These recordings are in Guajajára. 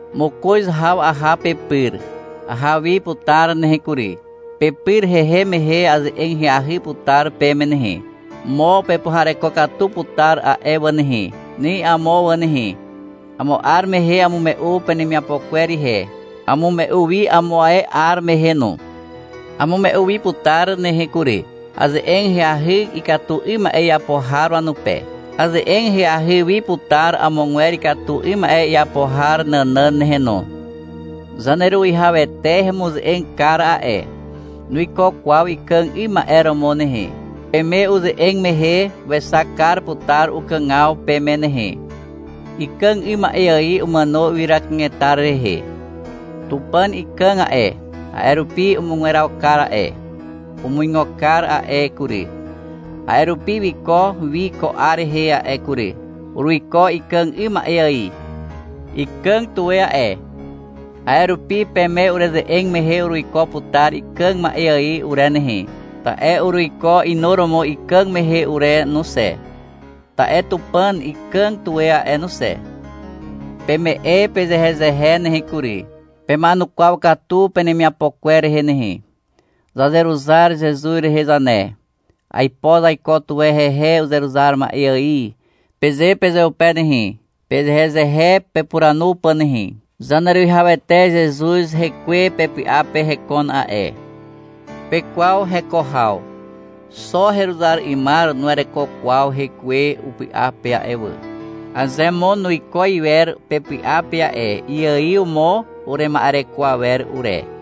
Mokoz haw aha pepyr. Aha wi putar nehe kury. Pepyr hehem mehe aze'eg ahyahy putar peme nehe. Mo pepuhareko katu putar a'e wà nehe. Ni amo wà nehe. Amo 'ar mehe amume'u penemiapo kwer ihe. Amume'u wi amo ae 'ar mehe no. Amume'u wi putar nehe kury. Aze'eg ahyahy ikatu 'ym ma'e iapo har wanupe. Aze'eg ahyahy wi putar amogwer ikatu 'ym ma'e iapo har nànàn nehe no. Zaneruwihawete hemuze'eg kar a'e. Nuiko kwaw ikàg 'ym ma'e romo nehe. Peme uze'eg mehe wexak kar putar ukàgaw peme nehe. Ikàg 'ym ma'e ài umàno ywyra kanetar rehe. Tupàn ikàg a'e, a'e rupi umugweraw kar a'e. Umuigo kar a'e kury. A'e rupi wiko wi ko 'ar rehe a'e kury. Uruiko ikàg 'ym ma'e ài. Ikàg tuwe a'e, a'e rupi peme ureze'eg mehe uruiko putar ikàg ma'e ài ure nehe, ta'e uruiko inuromo ikàg mehe ure no xe, ta'e Tupàn ikàg tuwe a'e no xe. Peme'e pezehezehe nehe kury. Pema'enukwaw katu penemiapo kwer rehe nehe. Zazeruzar Zezuz rehe zane. Aipo zaiko tuwe hehe uzeruzar ma'e ài, peze pezeupe nehe, pezehezehe pepuranu pà nehe. Zaneruwihawete Zezuz hekwe pepy'a pe hekon a'e. Pekwaw heko haw. Xo heruzar 'ymar nuwereko kwaw hekwe upy'a pe a'e wà. Aze mo nuiko iwer pepy'a pe a'e, iaiw mo urema'ereko awer ure.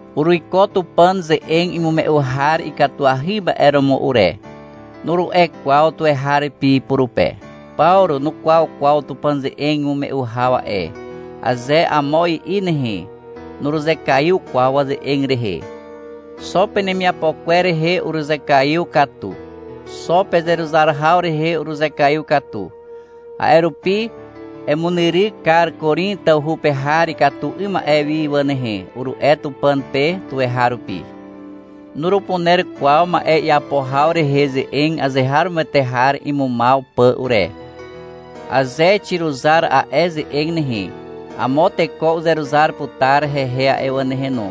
— Uruiko Tupàn ze'eg imume'u har ikatuahy ma'e romo ure, nuru'e kwaw tuweharupi purupe. — Pawru nukwaw kwaw Tupàn ze'eg imume'u haw a'e, aze amo i'i nehe, nuruzekaiw kwaw waze'eg rehe. Xo penemiapo kwer rehe uruzekaiw katu. Xo pezeruzar haw rehe uruzekaiw katu. A'e rupi — Emunyryk kar Korin tawhu pe har ikatu 'ym ma'e wi wà nehe, uru'e Tupàn pe tuweharupi. Nurupuner kwaw ma'e iapo haw rehe ze'eg azeharomoete har imumaw pà ure. Aze xiruzar a'e ze'eg nehe, amo teko uzeruzar putar hehe a'e wà nehe no.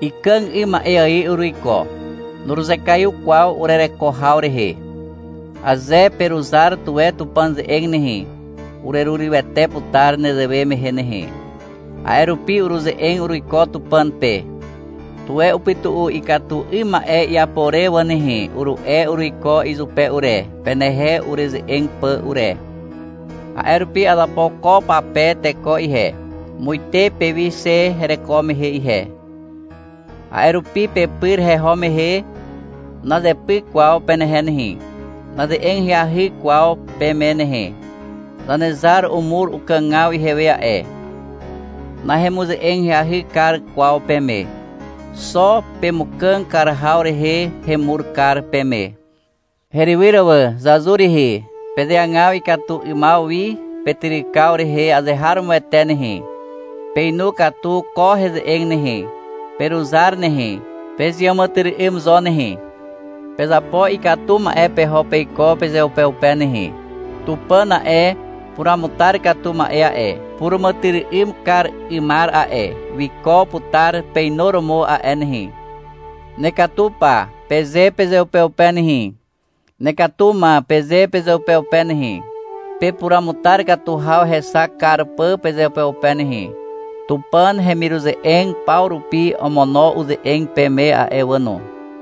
Ikàg 'ym ma'e ài uruiko. Nuruzekaiw kwaw urereko haw rehe. Aze peruzar tuwe Tupàn ze'eg nehe, urerurywete putar nezewe mehe nehe. A'e rupi uruze'eg uruiko Tupàn pe. — Tuwe upytu'u ikatu 'ym ma'e iapo re wà nehe, uru'e uruiko izupe ure, penehe ureze'eg pà ure. A'e rupi azapo ko pape teko ihe, muite pewi xe hereko mehe ihe. A'e rupi pepyr heho mehe, nazepyk kwaw penehe nehe, naze'eg ahyahy kwaw peme nehe. Zanezar umur ukàgaw ihewe a'e. Nahemuze'eg ahyahy kar kwaw peme. Xo pemukàg kar haw rehe hemur kar peme. Herywyr wà, zazur rihi. Pezeagaw ikatu 'ymaw wi petyrykaw rehe azeharomoete nehe. Peinu katu ko heze'eg nehe. Peruzar nehe. Pezeàmàtyry'ym zo nehe. Pezapo ikatu ma'e peho peiko pezeupeupe nehe. Tupàn a'e, puruamutar katu ma'e a'e, puràmàtyry'ym kar 'ymar a'e, wiko putar peinuromo a'e nehe. — Nekatu pa, peze pezeupeupe nehe. — Nekatu ma, peze pezeupeupe nehe. Pepuruamutar katu haw hexak kar pà pezeupeupe nehe. Tupàn hemiruze'eg paw rupi omono uze'eg peme a'e wà no.